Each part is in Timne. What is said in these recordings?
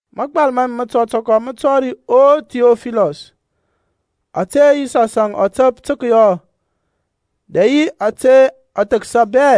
Magbal ma mi mətɔtɔkɔ mə tɔri O Thiɔfilɔs, ta ȧte Yisɔsȧŋ ɔ təp tə kəyɔ dɛ yi tə kəthəksa bɛ,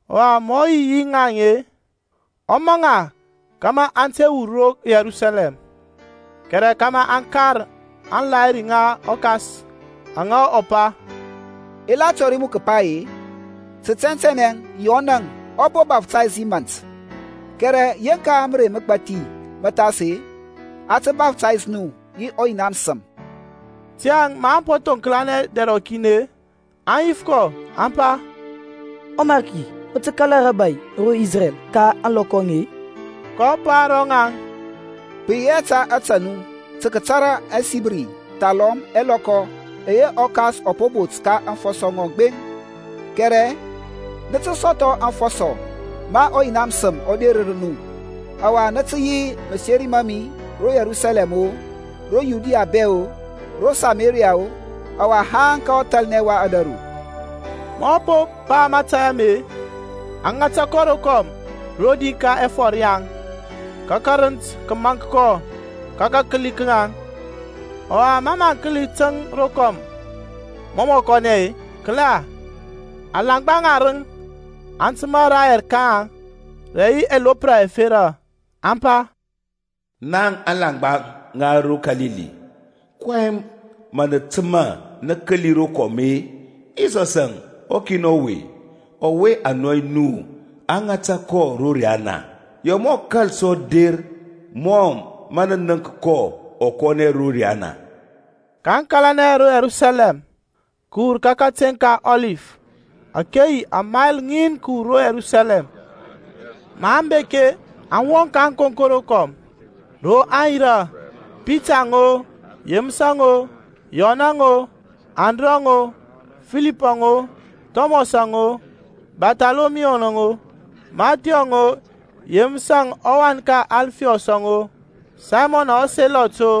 Ɔwa ma ɔ yi yi ŋaŋ-e, ɔ maŋ ŋa kȧmȧ aŋ te wur ro Yerusalɛm, kɛrɛ kȧmȧ aŋ kar aŋlahiri ŋa ɔKas, aŋa ɔ pa, I la tɔri nu kəpa-e, Tə tɛntɛnɛ Yɔnȧŋ ɔ po baftays yi mȧnt, kɛrɛ yeŋka mərey məgbathi mə thas-e, a tə baftays nu yi ɔYina məsəm. Tiyȧŋ maŋ po thoŋklanɛ dɛr rɔkin-e, aŋ yif kɔ, aŋ pa, ƆMariki mə tə kala rȧbȧy ro Isrɛl ka ȧŋlɔkɔ aŋe-i? kɔ pa ro ŋaŋ, Pə yi hɛ ta ȧtȧ nu tə kətara ɛsibri thalɔm ɛlɔkɔ ɛyɛ ɔKas ɔ po bot ka aŋfɔsɔ ŋɔŋ gbeŋ. Kɛrɛ nə tə sɔthɔ afɔsɔ ma ɔYina məsəm ɔ derər nu; ɔwa nə tə yi maseri ma mi ro Yerusalɛm-o, ro Yudia bɛ-o, ro Samaria-o, ɔwa haŋ ka ɔthalnɛ wa ȧdȧru. Ma ɔ po pa mȧtȧy ame-e, a ŋata kɔ rokɔm rodi ka ɛfɔr yaŋ, ka kərənt kə maŋk kɔ ka kakəli ka ŋaŋ. Ɔwa mɔ mə aŋ kəli təŋ rokɔm mɔ mɔ kɔnɛ-e, kəla, alaŋgba ŋarəŋ aŋ təmȧ rayɛr ka ŋaŋ rə ɛlopra ɛfera, aŋ pa, Naŋ alaŋgba ŋa ro Kalili, kɔyɛŋ mə nə təmȧ nə kəli rokɔm-e? Yisɔsȧŋ ɔkin ɔwe-e, ɔwe a nɔy nu a ŋata ro riana-e, ya mɔ kȧl sɔ der mɔ mə nə nənk kɔ ɔ kɔnɛ ro riyana. kaŋ kȧlanɛ ro Yerusaləm kəwur ka kateŋ ka Ɔlif, ȧke yi amayl ŋin kəwur ro Yerusalɛm. Maŋ bek-e, aŋ wɔŋ ka ȧŋkonko rokɔm, ro aŋ yirȧ; Pitaŋ-o, Yeməsȧŋ-o, Yɔnȧŋ-o, Andrɔŋ-o, Filipȧŋ-o, Thɔmɔsȧŋ-o, Barthɔlɔmiyuȧŋ-o, Mathyɔŋ-o Yeməsȧŋ ɔwan ka Alfiɔs-o, Saymɔnȧŋ ɔSelɔt-o,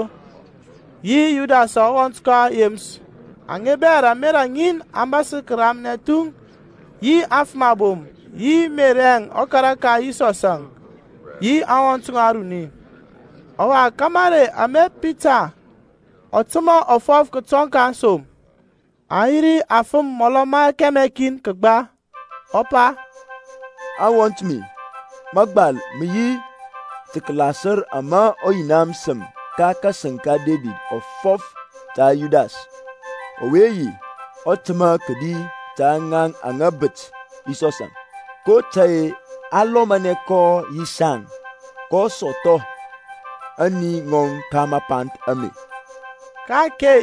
yi Yudasȧŋ ɔwɔnt ka Yeməsȧŋ. Aŋe bɛ rə ȧmerȧ ŋin aŋ bȧsər kəramnɛ thuŋ, yi aŋfəm abom, yi Merɛŋ ɔkara ka Yisɔsȧŋ yi aŋwɔnt ŋɔŋ aruni. Ɔwa ka marey ame Pitaŋ ɔ təmȧ ɔ fɔf kətɔŋ ka aŋsom, (aŋ yi ri afəm mɔlɔ ma kɛmɛ kin kəgba) ɔ pa, Awɔnt mi, mȧgbal mə yi tə kəlasər ama ɔYina məsəm ka kȧsəŋ ka Debid ɔ fɔf ta Yudas, ɔwe yi ɔtəma kədi ta ŋaŋ aŋa bət Yisɔsȧŋ. kotȧy-e a lɔmanɛ kɔ yi saŋ, kɔ sɔthɔ ȧŋni ŋɔŋ ka mapanth ame. (Ka-ake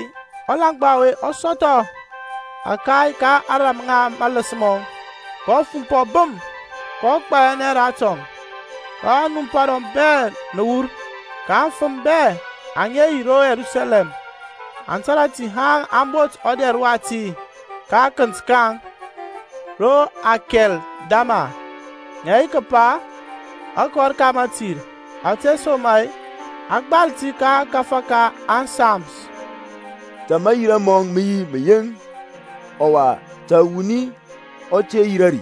ɔlaŋgba ɔwe ɔ sɔthɔ ȧkay ka ȧŋrȧm ŋa maləs mɔŋ, kɔ fumpɔ bəm, kɔ gbayanɛ ratɔŋ, ka anumpa ŋɔŋ bɛ nə wur. Ka aŋfəm bɛ aŋa yi ro Yerusalɛm aŋ tȧrȧ ti haŋ a bont ɔdɛr wati ka akənt ka ŋaŋ, Ro Akɛldama, ŋə yi kəpa, Akɔr ka Mətir). Ȧtesoma-e a gbal ti ka ȧkȧfȧ ka ȧŋSams, Ta mayira mɔŋ mə yi məyeŋ, Ɔwa, ta wuni ɔ te yirȧ ri;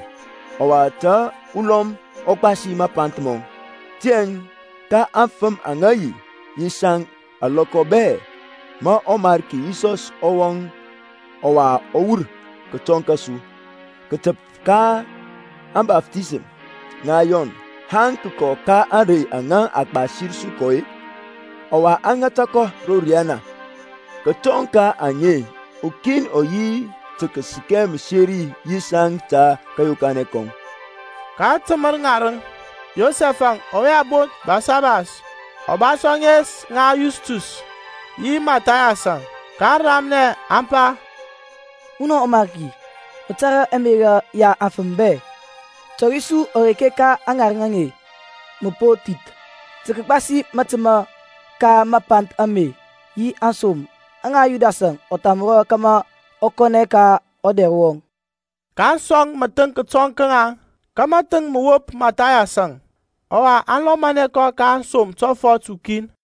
ɔwa Ta ulɔm ɔ gbasi mapanth mɔŋ. Tiyȧŋ ka aŋfəm aŋa yi yi saŋ alɔkɔ bɛ ma ɔMarki Yisɔs ɔ wɔŋ ɔwa ɔ wur kətɔŋ kȧsu, kətəp ka ȧŋbaftisəm ŋa Yɔn, haŋ kəkɔ ka ȧŋrey aŋa a gbasir su kɔ-e, ɔwa a ŋata kɔ ro riyana, kətɔŋ ka aŋe-e, ukin ɔ yi tə kəsəkɛ məseri yi saŋ ta kȧyokanɛ kɔŋ. kaŋ təmər ŋarəŋ, Yosɛf-əŋ ɔwe a bont Basabas, ɔ ba sɔ ȧŋes ŋa Yustus; yi Mathayas-əŋ. kaŋ ramnɛ, aŋ pa, Munɔ ɔMarki, mə tȧrȧ ɛmerȧ ya afəm bɛ, tɔri su ɔreke ka aŋarəŋ aŋe mə po thith, tə kəgbasi matəma ka mapanth ame yi aŋsom aŋa Yudasȧŋ ɔ thamrɔ kȧmȧ ɔ kɔnɛ ka ɔdɛr wɔŋ. kaŋ sɔŋ məthəŋ kətɔŋ ka ŋaŋ; ka mathəŋ mə wop Mathayas-əŋ. Ɔwa aŋ lɔmanɛ kɔ ka aŋsom tɔfɔt ukin.